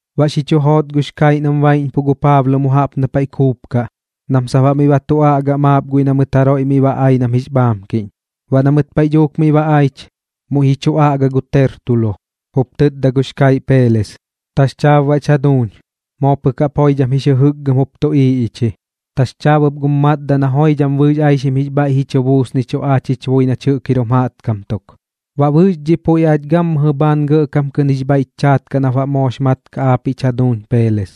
Baꞌ xi chu joot gux kaiꞌ nam baiꞌñpuꞌ gu Paablo mu jaꞌp na paiꞌ kuupkaꞌ nam sap baꞌ miꞌ ba tu aꞌgaꞌ maap guiꞌ na mɨt jaroiꞌ miꞌ ba ai nam jix bhaamkiꞌñ. Baꞌ na mɨt paiꞌ dhuuk miꞌ ba aich, muiꞌ ji chu aꞌga gu Tertulo, jup tɨtda gux kaiꞌ Peeles: ―Taxchaab baꞌch jaduuñ, moo pɨk jaꞌp joidham jix jɨjɨkgɨm jup tuꞌiiꞌ ich ji. Taxchaab ɨp gum matdaꞌ na joidham bɨɨx aixim jix bhaiꞌ ji chu buusnichuꞌ aach jich bui nach jir jum jaꞌtkam tuk. Baꞌ bɨɨx dhiꞌ puiꞌ aach gammɨjɨ bhaan gɇꞌkam kɨꞌn jix bhaiꞌch chaat nap baꞌ moox mat kaꞌ aapiꞌch jaduuñ Peeles.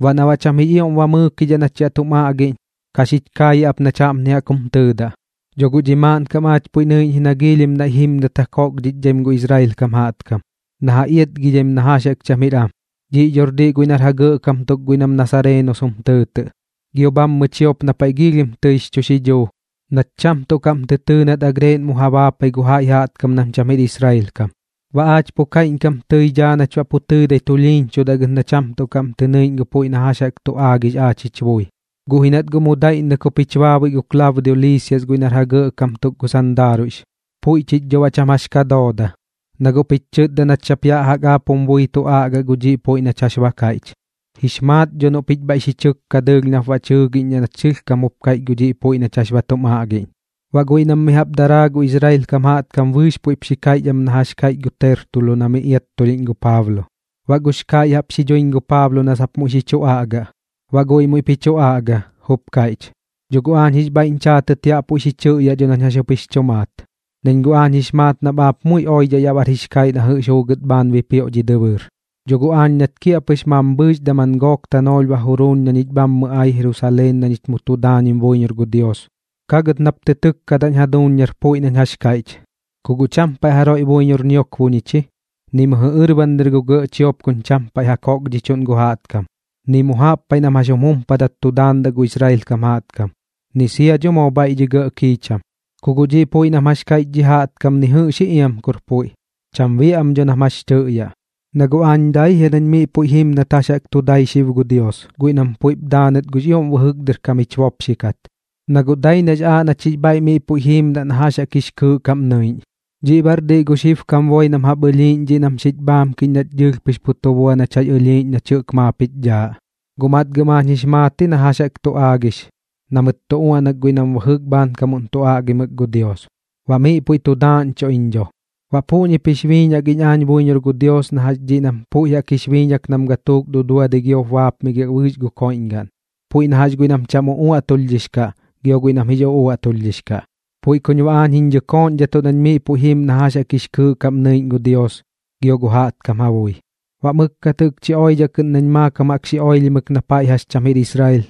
Baꞌ na cham jix ioꞌm ba ji mɨɨkidhaꞌ nach yaꞌ tum aꞌgiꞌñ, ka xich kaayaꞌ ap nach jaꞌpni jaꞌk jum tɨɨdaꞌ: Dho guꞌ dhi maaꞌnkam aach puiꞌ nɨiꞌñ ji na giilhim naiꞌ jimdat ja kokdhichdhaim gu Israel kam jaꞌtkam, na ja iatgidhim na jax jaꞌk cham jir am. Dhiꞌ dhor diꞌ guiꞌ nar ja gɇꞌkam tuk guiꞌ nam nasareenos jum tɨɨtɨꞌ. Gio bhammɨ chiop na paiꞌ tɨi giilhim jix chu xidhuu, nat cham tuꞌ kaꞌm tɨ tɨɨ nat agreeꞌn mu ja baapai gu jaiꞌ jaꞌtkam nam cham jir Israel kam. Baꞌ aach pu kaiꞌñkam tɨi daa nach baꞌ pu tɨɨdai tulhiiñchudaꞌ gɨt na cham tuꞌ kaꞌm tɨ nɨiꞌñ gu puiꞌ na jax jaꞌk tu aagix aach jich bui. Guꞌ ji nat guꞌ mu daiꞌññɨk jup jich baabui gu Klaudio Liisias guiꞌ nar ja gɇꞌkam tuk gu sandaaruiꞌx. Puiꞌ chich dho baꞌ cham jax dhooda, na guꞌ puiꞌch chɨtda nach sap yaꞌ jaꞌk aap jum bui tu aꞌgaꞌ gu dhiꞌ puiꞌ nach jax ba kaiꞌch. Jix maat dho noꞌ pich bhaiꞌ xi chɨkka dɨɨlh nap baꞌ ba tɨ jɨɨgiꞌñdhaꞌ nach sɨlhkam jup kaiꞌch gu dhiꞌ puiꞌ nach jax ba tum aꞌgiꞌñ. Baꞌ guiꞌ nam mi jaꞌp jup daraa gu Israel kam jaꞌtkam bɨɨx puiꞌp xi kaiꞌch am na jax kaiꞌch gu Tertulo na miꞌ iattulhiꞌñ gu Paablo. Baꞌ gux kaiꞌ jaꞌp xi duiñ gu Paablo na sap muiꞌ xi chu aꞌgaꞌ. Baꞌ guiꞌ muiꞌp ji chu aꞌga, jup kaiꞌch: ―Dho guꞌ aañ jix bhaiꞌñ chaatɨt yaꞌ puiꞌ xi chɨꞌyaꞌ dho nañ jax jaꞌk jup xiñ maat, nañ guꞌx maat nap aap muiꞌ oidhaꞌ yaꞌ bar jix kaiꞌ na jɨꞌx juugɨt bhaan bipioꞌ dhi dɨbɨɨr. Dho guꞌ aañ nat kiaꞌpɨx mambhɨɨx daman gook tanoolh ba juruuñ na ñich bhammɨ ai Jerusaleen na ñich mu tu daañim buiñor gu Dios, kagɨt nap tɨkkadaꞌñ jaduuñ nar puiꞌ nañ jax kaiꞌch. Ku guꞌ cham paiꞌ jaroiꞌ buiñor ñiokbo ñich ji, ni mɨjɨ ɨrban dɨr gu gɇꞌ chiop kuñ cham paiꞌ ja kokdhichuꞌn gu jaꞌtkam, ni mu jaꞌp paiꞌ nam jax jum jumpadat tu daandaꞌ gu Israel kam jaꞌtkam, ni sia dho moo bhaiꞌ dhi gɇꞌ kiicham. Ku guꞌ dhiꞌ puiꞌ nam jax kaiꞌch dhi jaꞌtkam ni jɨꞌx ji iam kur puiꞌ, cham biaꞌ am dho nam jax tɨꞌyaꞌ. Na guꞌ aañ dai jia nañ miꞌ puiꞌ jim nat jax jaꞌk tu dai xib gu Dios guiꞌ nam puiꞌp daanɨt gux ioꞌm bɨjɨk dɨr kam jich bopxi kat, na guꞌ dai nax aaꞌ nach jix bhaiꞌ miꞌ puiꞌ jiimdaꞌ na jax jaꞌk jix kɨɨꞌ kaꞌm nɨiꞌñ. Dhiꞌ baꞌr diꞌ gu xibkam boi nam jaꞌp ɨlhiiꞌñ dhiꞌ nam xiñ bhaamkiꞌñ nach dɨɨlh pɨx pu tu bua nach jax ɨlhiiꞌñ nach jɨꞌk maap jich dhaaꞌ. Guꞌ matgɨm aañ jix maat ji na jax jaꞌk tu aagix na mɨt tu uaꞌnak guiꞌ nam bɨjɨk bhaankamuꞌn tu aꞌgimɨk gu Dios, baꞌ miꞌ puiꞌ tu daaꞌñchuꞌ iñ dho. Baꞌ puꞌñip jix biiñak iñ aañ buiñor gu Dios na jax dhiꞌ am nam puiꞌ jaꞌk jix biiñak nam gatuuk duduadɨi giop baapmigiaꞌ bɨɨx gu koiꞌñgaꞌn, puiꞌ na jax guiꞌ nam cham uꞌuaꞌtulhdhix kaꞌ gio guiꞌ nam jix uꞌuaꞌtulhdhix kaꞌ. Puiꞌ kuñ baꞌ aañ jiñ dhɨkooꞌñdhatuꞌ nañ miꞌ puiꞌ jim na jax jaꞌk jix kɨɨꞌ kaꞌm nɨiꞌñ gu Dios gio gu jaꞌtkam ja bui. ’Baꞌ mɨkkat jɨꞌkchi oidhaꞌ kɨꞌn nañ maakam jaꞌk xi oilhimɨk na paiꞌ jax cham jir Israel,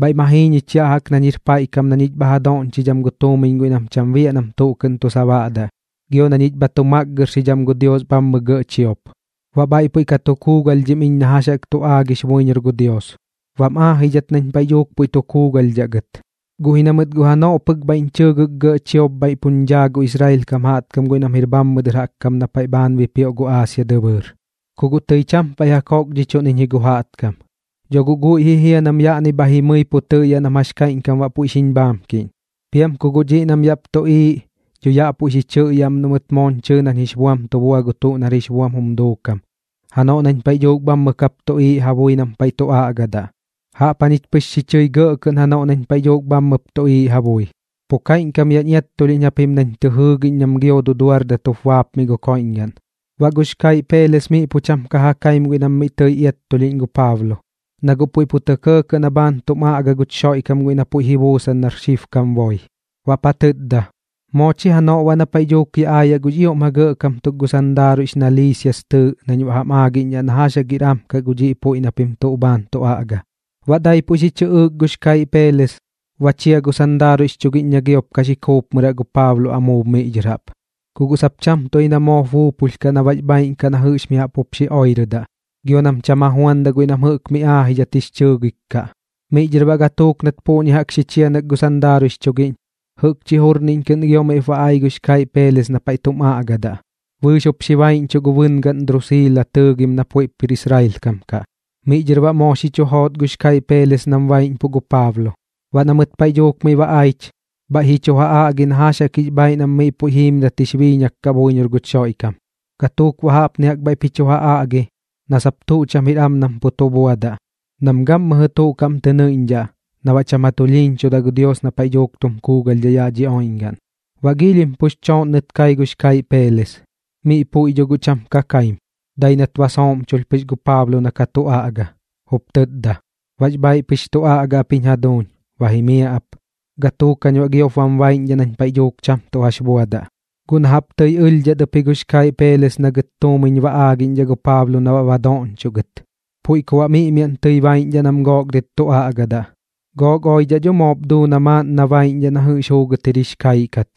bhaiꞌ ma jii ñich yaꞌ jaꞌk nañ jir paiꞌ kam na ñich bha ja doꞌñchidham gu tuumiñ guiꞌ nam cham biaꞌ nam tuꞌ kɨꞌn tu sabaꞌdaꞌ, gio na ñich bha tu makgɨrxidham gu Dios bhammɨ gɇꞌ chiop. Baꞌ bhaiꞌ puiꞌ ka tu kuugalhdhim iñ na jax jaꞌk tu aagix buiñor gu Dios, bam aajidhat nañ paiꞌ dhuuk puiꞌ tu kuugalhdhaꞌ gɨt, guꞌ ji na mɨt guꞌ janoꞌ pɨk bhaiꞌñ chɨɨgɨk gɇꞌ chiop bhaiꞌ puñ dhaa gu Israel kam jaꞌtkam guiꞌ nam jir bhammɨ dɨr jaꞌk kam na paiꞌ bhaan bipioꞌ gu Aasia dɨbɨɨr, ku guꞌ tɨi cham paiꞌ ja kokdhichuꞌn iñ ji gu jaꞌtkam. Dho guꞌ guiꞌ ji jia nam yaꞌni bha jimɨi pu tɨꞌyaꞌ nam jax kaiꞌñkam baꞌ puiꞌ xiñ bhaamkiꞌñ. Piam kum guꞌ dhiꞌ nam yaꞌp tuꞌiiꞌ, dho yaꞌ puiꞌ xi chɨꞌyaꞌ am noꞌ mɨt mooñ chɨɨ nañ jix buam tu bua gu tuꞌ nar jix buam jum duukam janoꞌ nañ paiꞌ dhuuk bhammɨ kap tuꞌiiꞌ ja bui nam paiꞌ tu aꞌgadaꞌ. Jaꞌp jañich pɨx xi chɨi gɇꞌ kɨꞌn janoꞌ nañ paiꞌ dhuuk bhammɨp tuꞌiiꞌ ja bui: “Pu kaiꞌñkam yaꞌñ iattulhiꞌñ japim nañ tɨ jɨɨgiꞌñ nam gio duduardat jup bapmiꞌ gu koiꞌñgaꞌn.” Baꞌ gux kaiꞌ Peeles miꞌ puiꞌ cham ka ja kaim guiꞌ nam miꞌ tɨi ka iattulhiꞌñ gu Paablo, na guꞌ puiꞌ pu tɇ kɇɇkɇꞌ na bhaan tum aꞌga guch Xoiꞌkam guiꞌ na puiꞌ ji buusan nar xibkam boi. Baꞌp ja tɨtda: ―Moo chi janoꞌ baꞌ na paiꞌ dhuuk yaꞌ aayaꞌ gux ioꞌm ja gɇꞌkam tuk gu sandaaruiꞌx na Liisias tɨɨꞌ nañ baꞌ jam aagiꞌñdhaꞌ na jax jaꞌk jir am kaꞌ gu dhiꞌ puiꞌ na pim tuꞌ bhaan tu aꞌga. Baꞌ daipuꞌ xi chɨꞌɨɨk gux kaiꞌ Peeles, ba chia gu sandaaruiꞌx chugiꞌñ na giop ka xi kuupmɨraꞌ gu Paablo amuub miꞌ dhɨr jaꞌp, ku guꞌ sap cham tuꞌ ji na moop buupulh kaꞌ na baꞌx bhaaiꞌn kaꞌ na jɨꞌx mi jaꞌp jup xi oirɨdaꞌ, gio nam cham ja juandaꞌ guiꞌ nam jɨꞌk mi aajidhat jix chɨɨgik kaꞌ. Miꞌ dhɨr baꞌ gatuuk nat puꞌñi jaꞌk xi chianɨk gu sandaaruiꞌx chugiꞌñ, jɨꞌkchi jurniꞌñ kɨꞌn gio miꞌp ba ai gux kaiꞌ Peeles na paiꞌ tum aꞌgadaꞌ, bɨɨx jup xi baiꞌñchuꞌ gu bɨngaꞌn Drusiila tɨɨgim na puiꞌp jir Israel kam kaꞌ. Miꞌ dhɨr baꞌ moo xi chu joot gux kaiꞌ Peeles nam baiꞌñpuꞌ gu Paablo. Baꞌ na mɨt paiꞌ dhuuk miꞌ ba aich, bhaiꞌ ji chu ja aꞌgi na jax jaꞌk jix bhaiꞌ nam miꞌ puiꞌ jiimdat jix biiñak kaꞌ buiñor guch Xoiꞌkam. Gatuuk baꞌ jaꞌpni jaꞌk bhaiꞌp ji chu ja aꞌgi, na sap tuꞌ cham jir am nam pu tu buadaꞌ, nam gammɨjɨ tuꞌ kaꞌm tɨ nɨiꞌñdhaꞌ na baꞌ cham ja tulhiiñchudaꞌ gu Dios na paiꞌ dhuuk tum kuugalhdhaꞌ yaꞌ dhi oiꞌñgaꞌn. Baꞌ giilhim pux chooꞌnnɨt kai gux kaiꞌ Peeles, miꞌ puiꞌ dho guꞌ cham ka kaim, dai nat ba sooꞌmchulh pɨx gu Paablo na ka tu aꞌga, jup tɨtda: ―Bax bhaiꞌ pɨx tu aꞌga ap jiñ jaduuñ. Ba jimiaꞌ ap, gatuuk jañ baꞌ giop bam baiꞌñdhaꞌ nañ paiꞌ dhuuk cham tuꞌ jax buadaꞌ. Guꞌ na jaꞌp tɨi ɨlhdhat ɨp ji gux kaiꞌ Peeles na gɨt tuꞌ tuumiñ ba aagiꞌñdhaꞌ gu Paablo na baꞌ ba doꞌñchoꞌ gɨt, puiꞌ ku baꞌ miꞌmiaꞌn tɨi baiꞌñdhaꞌ nam gook dɨt tu aꞌgadaꞌ. Gook oidhaꞌ dho guꞌ moop duu na maaꞌn na baiꞌñdhaꞌ na jɨꞌx juugɨt jir jix kaiꞌ kat.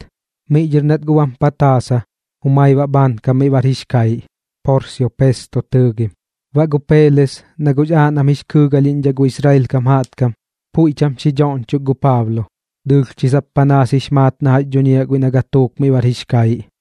Miꞌ dhɨr nat guꞌ bam pataasa, jumai baꞌ bhaankam miꞌ bar jix kaiꞌ, Porsio Pesto tɨɨgim. Baꞌ gu Peeles, na guꞌx aaꞌ nam jix kɨɨgalhiꞌñdhaꞌ gu Israel kam jaꞌtkam, puiꞌ cham xi dhoꞌñchok gu Paablo. Dɨɨlh chi sap panaas jix maat na jax dhuñiaꞌ guiꞌ na gatuuk miꞌ bar jix kaiꞌ.